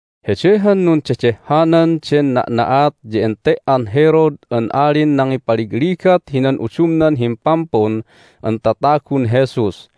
Hede han nundedehhanan den na'na'at ya ente"an Herod an alin nangipaligligat hinan udumnan Himpampun an Tatagun Jesus.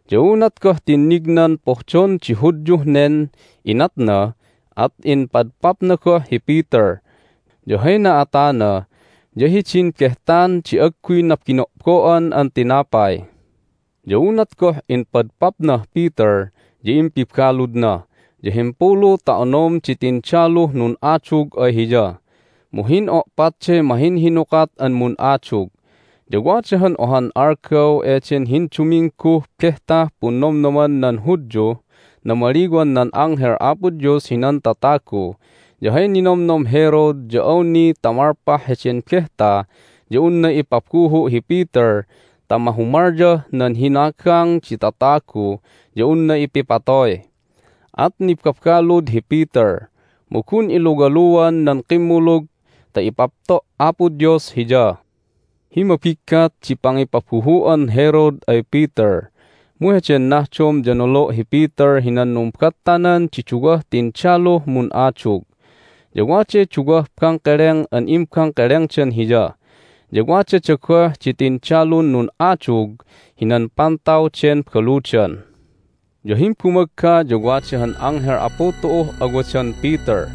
Ya unat goh tinnignan pohdon di Hudyuh nen inatna at impadpapna goh hi Peter. Ya hay na'atana ya hidin Behtan di Agguy Nabino'bo'an an Tinapay. Ya unat goh impadpapnah Peter ya impibaludna, ya himpulu ta onom di tindaluh nun'adug ay hiya, mu hin'o'patday mahinhinukat an mun'adug. Ya wada han ohan algaw eden hindumingguh Behtah Punnomnoman nan Hudyuh Namaliwan nan Anghel Apo Dios hinan Tatagu, ya hay ninomnom Herod ya awni ta malpah heden behta ya unna ipabuhu' hi Peter ta mahumalyah nan hinagang di tatagu ya unna ipipatoy. At nibabalud hi Peter, mu gun iluwaluan nan kimmulug ta ipapto' Apo Dios hiya. Hi mabiggat di pangipabuhu'an Herod ay Peter, mu heden nahdom ya nolo' hi Peter hinan numbattanan di duwah tindaluh mun'adug. Ya waday duwah bangkeleng an imbangkelengdan hiya, ya wadada goh di tindalun nun'adug hinan pantaw den baludan. Ya himbumagga ya wada han anghel Apu tu'uh awadan Peter,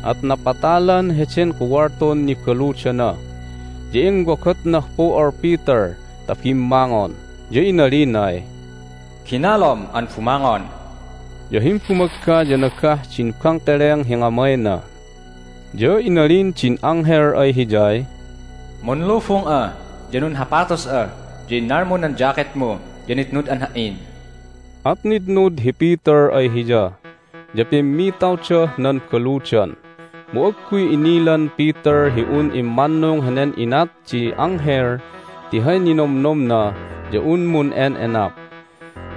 at napatalan heden kuwaltun nibaludana. Ya inwogotnah pu'ol Peter ta bimmangon, ya inalinay, "Ginalom an bumangon!" Ya himbumagga ya nagah din bangkeleng hi ngamayna. Ya inalin din anghel ay hiyay, "Munlubung'a, ya nunhapatus'a, ya innalmu nan jacketmu, ya nitnud'an ha"in!" At nitnud hi Peter ay hiya, ya pimmitawdah nan baludan. Mu agguy inilan Peter hi un immannung henen inat di anghel ti hay ninomnomna ya un mun'en'enap.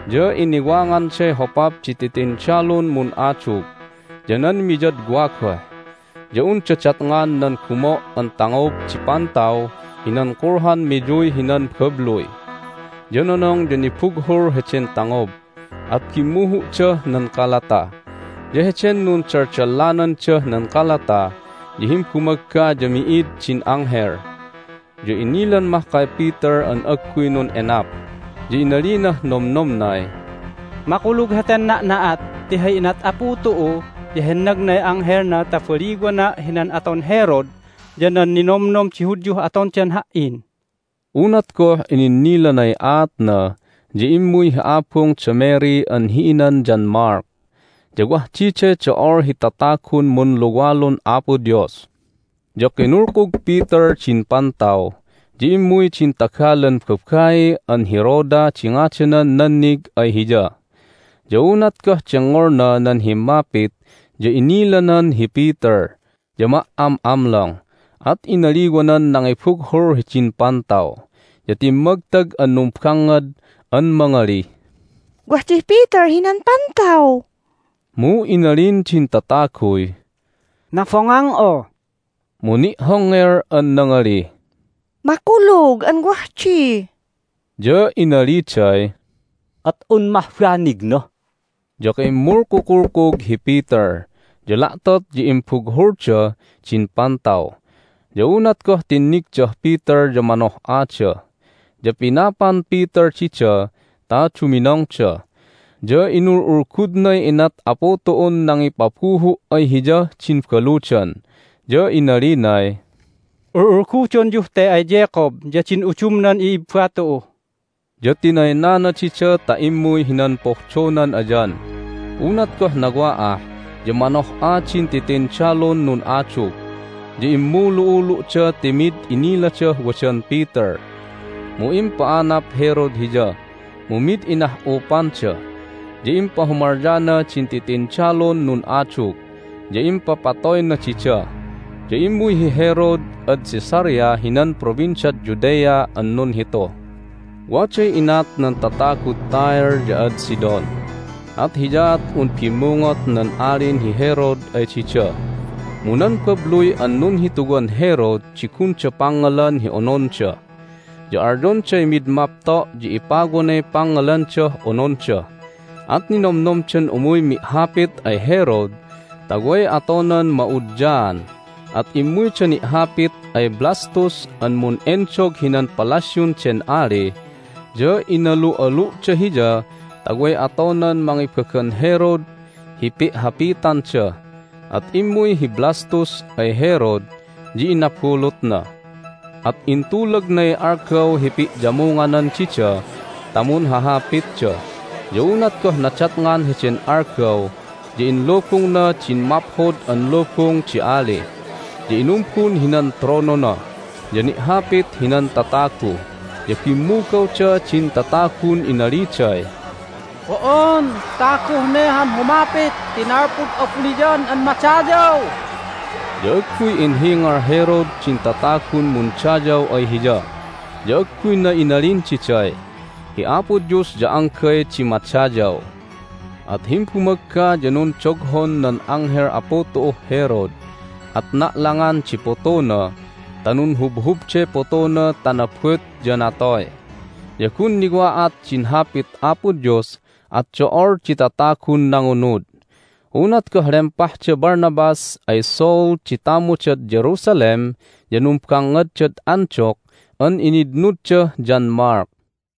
Ya iniwanganday hopap di titindalun mun'adug, ya nan miyadwa goh, ya unda datngan nan gumo' an tangob di pantaw hinan kulhan miyuy hinan babluy. Ya nonong ya nibughul heden tangob, at bimmuhu'dah nan kalata. Ya heden nundaldalanandah nan kalata ya himbumagga ya mi'id din anghel. Ya inilan mahkay Peter an agguy nun'enap, ya inalinah nomnomnay, "Makulug heten na'na'at! Ti hay inat Apu tu'u ya hennagnay anghelna ta baliwana' hinan aton Herod ya nan ninomnom di Hudyuh atondan ha"in!" Unat goh ininnilanay aatna ya immuy hi abung da Mary an hi inan John Mark. Ya wah diday do'ol hi tatagun munluwalun Apo Dios. Ya kinulkug Peter din pantaw, ya immuy din tagalan babai an hi Rhoda di ngadanan nannig ay hiya. Ya unat goh dengngolna nan himmapit ya inilanan hi Peter, ya ma"am'amlong, at inaliwanan nangibughul hidin pantaw, ya timmagtag an numbangngad an mangalih, "Wah dih Peter hinan pantaw!" Mu inalin din tataguy, "Nabongang'a!" Mu ni'hongngel an nangalih, "Makulug an wah di!" Ya inaliday, "At un mah banigna!" Ya kimmulkukulkug hi Peter, ya la'tot ya imbughulda din pantaw. Ya unat goh tinnigdah Peter ya manoh'ada. Ya pinapan Peter dida ta duminongda, ya inul'ulgudnay inat Apu tu'un nangipabuhu' ay hiyah din baludan. Ya inalinay, "Ul'ulgudonyuh te ay Jacob ya din udumnan i'ibba tu'u." Ya tinaynana dida ta immuy hinan pohdonan ayan. Unat goh nawa'ah ya manoh'a din titindalun nun'adug, ya immulu'ulu'da ti mid iniladah wadan Peter. Mu impa'anap Herod hiya, mu mid inah'upanda. Ya impahumalyana din titindalun nun'adug, ya impapatoyna dida. Ya immuy hi Herod ad Caesarea hinan Provinciad Judea an nunhitu. Waday inat nan tatagud Tyre ya ad Sidon, at hiyaat un bimmungot nan Alin hi Herod ay dida. Mu nan babluy an nunhituwan Herod di gunda pangngalan hi ononda, ya alyonday mid mapto' ya ipawanay pangngalandah ononda. At ninomnomdan umuy mi'hapit ay Herod ta way atonan ma'udyaan. At immuyda ni'hapit ay Blastus an mun'endog hinan palasyun den ali, ya inalu'alu'da hiya ta way atonan mangibagan Herod hi pi'hapitanda. At immuy hi Blastus ay Herod, ya inabulutna. At intulagnay algaw hi pi'yamunganan dida ta munhahapitda. Ya unat goh nadatngan heden algaw ya inlubungna din maphod an lubung di ali, ya inumbun hinan tronona, ya ni'hapit hinan tatagu. Ya bimmugawda din tatagun inaliday, "Bo'on taguh ne han humapit ti nalpud abuniyan an madayaw!" Ya agguy inhingal Herod din tatagun mundayaw ay hiya, ya agguyna inalin diday, "Hi Apo Dios ya anggay di madayaw!" At himbumagga ya nundoghon nan anghel Apu tu'uh Herod, at na'langan di putuna ta nunhubhubday putuna ta nabut, ya natoy. Ya gun niwa'at din Hapit Apo Dios, at do'ol di tatagun nangunud. Unat goh lempah da Barnabas ay Saul di tamudad Jerusalem ya numbangngadad Antioch an initnuddah John Mark.